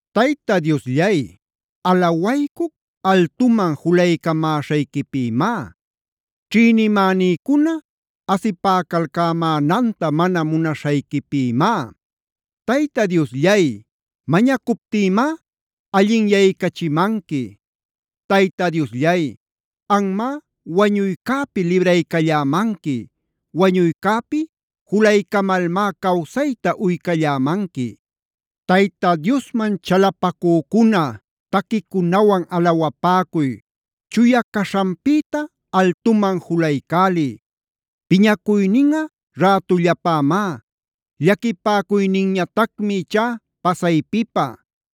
Tayta Diosllay, alawaycuc altuman julaycamäśhayquipïmá, ćhïnimänïcuna asipäcalcämänanta mana munaśhayquipïmá. Tayta Diosllay, mañacuptïmá allinyaycachimanqui. Tayta Diosllay, anmá wañuycäpi libraycallämanqui. Wañuycäpi julaycamalmá cawsayta uycallämanqui. Tayta Diosman chalapacücuna taquicunawan alawapäcuy. Chuya caśhanpïta altuman juluycäliy. Piñacuyninꞌa rätullapämá. Llaquipäcuyninñatacmi ichá pasaypipä.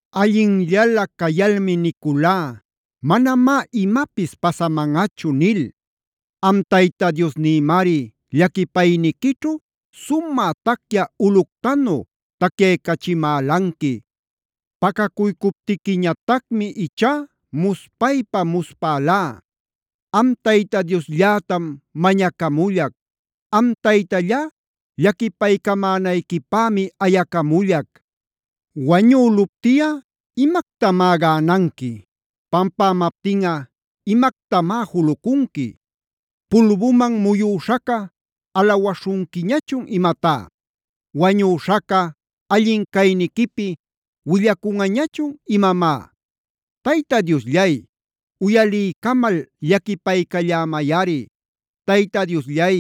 Allinllalä cayalmi niculá: “Manamá imapis pasamanꞌachu” nil. Am Tayta Diosnïmari llaquipayniquićhu sumä tacyä ulꞌuctanu tacyaycachimälanqui. Pacacuycuptiquiñatacmi ichá muspaypa-muspälá. Am Tayta diosllätam mañacamullac; am Taytallá llaquipaycamänayquipämi ayacamullac. ¿¡Wañüluptiꞌa imactamá gänanqui!? ¿¡Pampämaptinꞌa imactamá julucunqui!? ¿¡Pulbuman muyüśhaca alawaśhunquiñachun imatá!? ¿¡Wañüśhaca allin cayniquipi willacunꞌañachun imamá!? Tayta Diosllay, uyaliycamal llaquipaycallämayꞌari; Tayta Diosllay,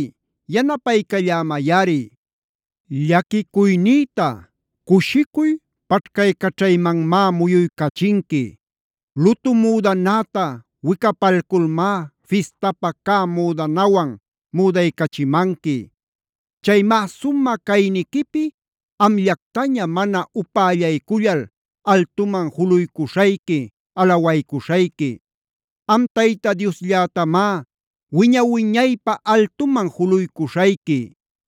yanapaycallämayꞌari. Llaquicuynïta cushicuy paćhcaycaćhaymanmá muyuycachinqui. Lutu müdanäta wicapalculmá fistapä cä müdanawan müdaycachimanqui. Chaymá sumä cayniquipi amllactaña mana upällaycullal altuman juluycuśhayqui, alawaycuśhayqui; am Tayta Diosllätamá wiña-wiñaypä altuman juluycuśhayqui.